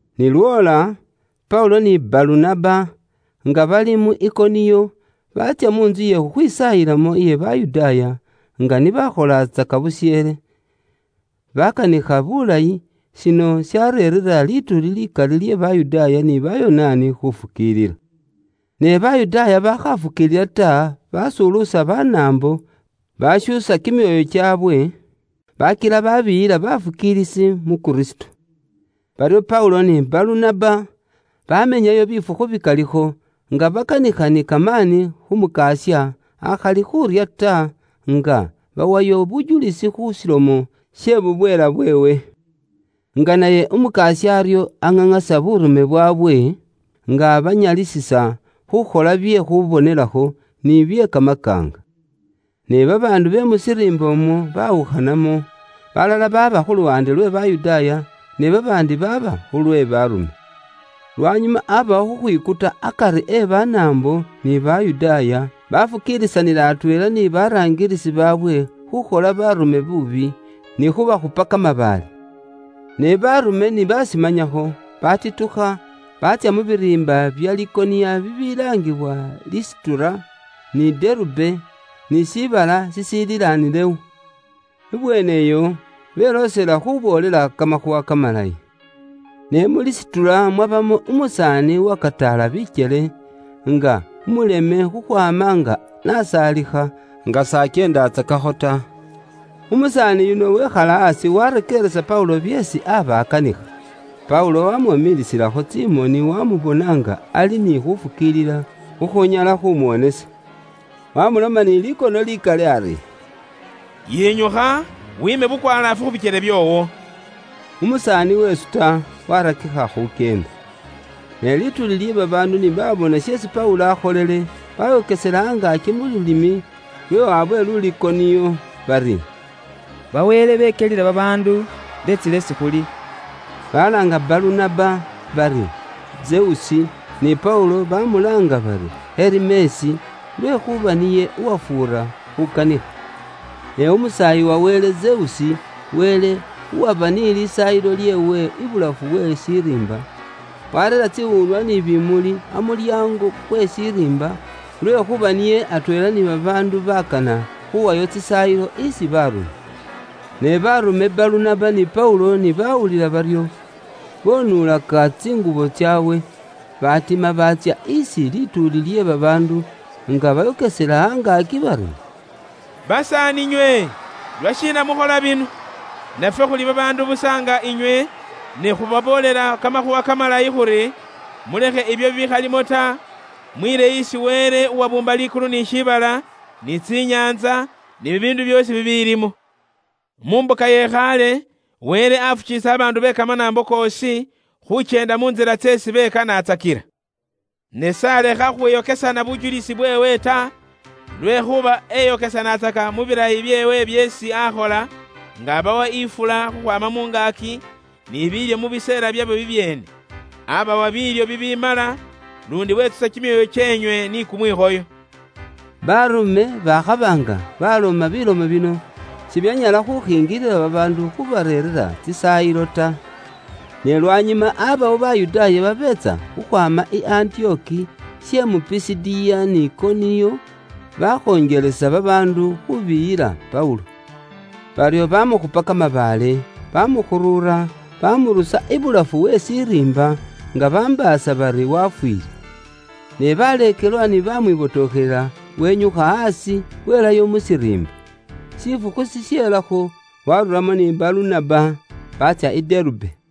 Ni lwoola, Paulo ni Balunaba nga bali mu Ikoniyo, baatsya mu ntsu iye khukhwisaayilamo iye Bayudaaya (nga ni bakholatsaka busheele). Baakanikha buulayi, shino shareerera lituuli likali lye Bayudaaya ni Bayonaani khufukiilila. Ne Bayudaaya bakhafukiilila ta, baasuluusa Banaambo, baashuusa kimyoyo kyaabwe, baakila baabiiyila bafukiilisi mu Kristo. Baryo Paulo ni Balunaba, baamenyayo bifukhu bikalikho, nga bakanikha ni kamaani khu Mukasya, akhali khuurya ta, nga bawayo bujulisi khu shilomo she bubweela bweewe. Nga naye Umukasya aryo nga aŋaŋasa buurume bwaabwe, nga abanyalisisa khuukhola bye khuubonelakho, ni bye kamakaanga. Ne babaandu be mu shiriimba umwo baawukhanamo; balala baaba khu luwaande lwe Bayudaaya, ne babaandi baaba khulwe Baarume. Lwanyuma abawo khukhwikuta akari e Banaambo ni Bayudaaya, bafukiilisanila atweela ni baraangilisi baabwe khukhola baarume buubi, ni khubakhupa kamabaale. Ne Baarume ni bashimanyakho, batitukha baatsya mu biriimba bya Likoniya bibilaangibwa Lisitura, ni Derube, ni shiibala shishiililanilewo. Ibweeneyo, beloosela khuboolela kamakhuuwa kamalayi. Ne mu Lisitura mwabamo umusaani uwakataala bikyele, nga umuleme khukhwaama nga n'asaalikha, nga s'akyeendatsakakho ta. Umusaani yuno wekhala aasi warekeeresa Paulo byeesi aba akanikha. Paulo wamwomiisilakho tsimoni wamubona nga ali ni khufukiilila khukhunyala khumuwonesa. Wamuloma ni likono likali ari, “Yinyukha wiime bukwalaafu khu bikyele byoowo.” Umusaani wesuta, warakikha khukyenda. Ne lituuli lye babaandu ni baabona sheesi Paulo akholile, bayokesela angaaki mu lulimi lwe waabwe Lulikoniyo bari, “Bawele bekyelile babaandu beetsile isi khuli!” Balaanga Balunaba bari, “Zeusi,” ni Paulo bamulaanga bari, “Herimesi,” lwekhuuba niye uwafuura khukanikha. Ne umusaayi wa wele Zeusi, wele uwaba ni lisaayilo lyeewe abulafu we shiriimba, wareera tsiwuunwa ni bimuli amulyaango kwe shiriimba, lwekhuuba niye atweela ni babaandu bakana khuwayo tsisaayilo isi baarume. Ne baarume Balunaba ni Paulo ni bawulila baryo, bonuulaka tsingubo tsaabwe, batima baatsya isi lituuli lye babaandu, nga bayokesela angaaki bari, “Basaaninywe, lwashiina mukhola bino? Nafwe khuli babaandu busa nga inywe, ne khubaboolela Kamakhuuwa Kamalayi khuri, mulekhe ibyo bikhalimo ta, mwiile isi Wele uwabuumba likulu ni shiibala, ni tsinyaantsa, ni bibiindu byoosi bibilimo. Mu mbuka iye khaale, Wele afukiilisa babaandu be kamanaambo koosi khukyenda mu ntsila tseesi bekanatsakila. Ne s'alekha khukhwiyokesana bujulisi bweewe ta, lwekhuuba eyokesanatsaka mu bilayi byeewe byeesi akhola, nga abawa ifula khukhwaama mu ngaaki, ni biilyo mu biseela byabyo bibyeene. Abawa biilyo bibimala, luundi wetsusa kimyoyo kyeenywe ni kumwikhoyo.” Baarume bakhaba nga baloma bilomo bino, sibyanyala khukhingilila babaandu khubareerera tsisaayilo ta. Ne lwanyuma abawo Bayudaaya babeetsa khukhwaama i Antiyoki she mu Pisidiya ni Ikoniyo, bakhonjelesa babaandu khubiyila Paulo. Baryo bamukhupa kamabaale, bamukhuruura, bamurusa ibulafu we shiriimba, nga bambaasa bari wafwiile. Ne baleekelwa ni bamwibotokhelela, wenyukha aasi, welayo mu shiriimba. Shifukhu shishelakho, waaruramo ni Balunaba, baatsya i Derube.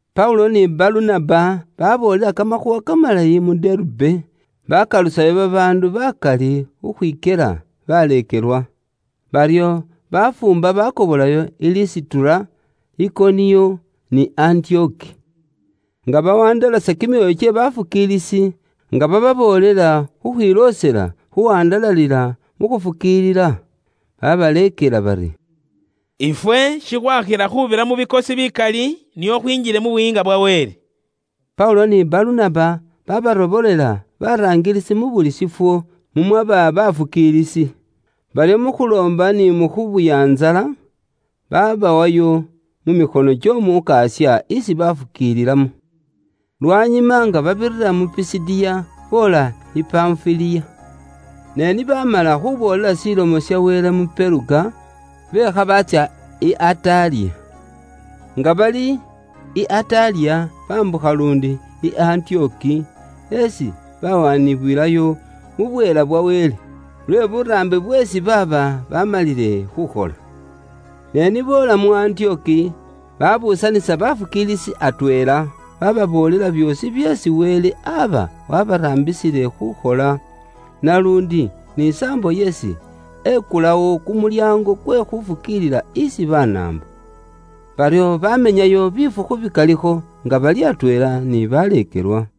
Paulo ni Balunaba baboolela Kamakhuuwa kamalayi mu Derube, baakalusayo babaandu baakali khukhwikyela baleekelwa. Baryo bafuumba baakobolayo i Lisitura, Ikoniyo, ni Antiyoki; nga bawandalasa kimyoyo kye baleekelwa, nga bababoolela khukhwiloosela khuwandalalila mu khufukiilila. Babaleekela bari, “Ifwe shikhwakhila khubira mu bikosi bikali, nio khwinjile mu Buyiinga bwa Wele.” Paulo ni Balunaba baabarobolela baraangilisi mu buli shifwo mumwaba baafukiilisi. Baryo mu khuloomba ni mu khubuya ntsala, baabawayo mu mikhono ky'Omukasya isi bafukiililamo. Lwanyuma nga babirira mu Pisidiya, boola i Panfiliya. Ne ni baamala khuuboolela Ilomo ya Wele mu Peruga, beekha baatsya i Ataliya. Nga bali i Ataliya, baambukha luundi i Antiyoki, isi baawaanibwilayo mu bweela bwa Wele, lwe buraambi bweesi baaba baamalile khuukhola. Ne ni boola mu Antiyoki, baabuusanisa baafukiilisi atweela, baababoolela byoosi byeesi Wele aaba waabaraambisile khuukhola, naluundi ni saambo isi ekulawo kumulyaango kwe khuufukiilila isi Banaambo. Baryo baamenyayo bifukhu bikalikho nga bali atweela ni baleekelwa.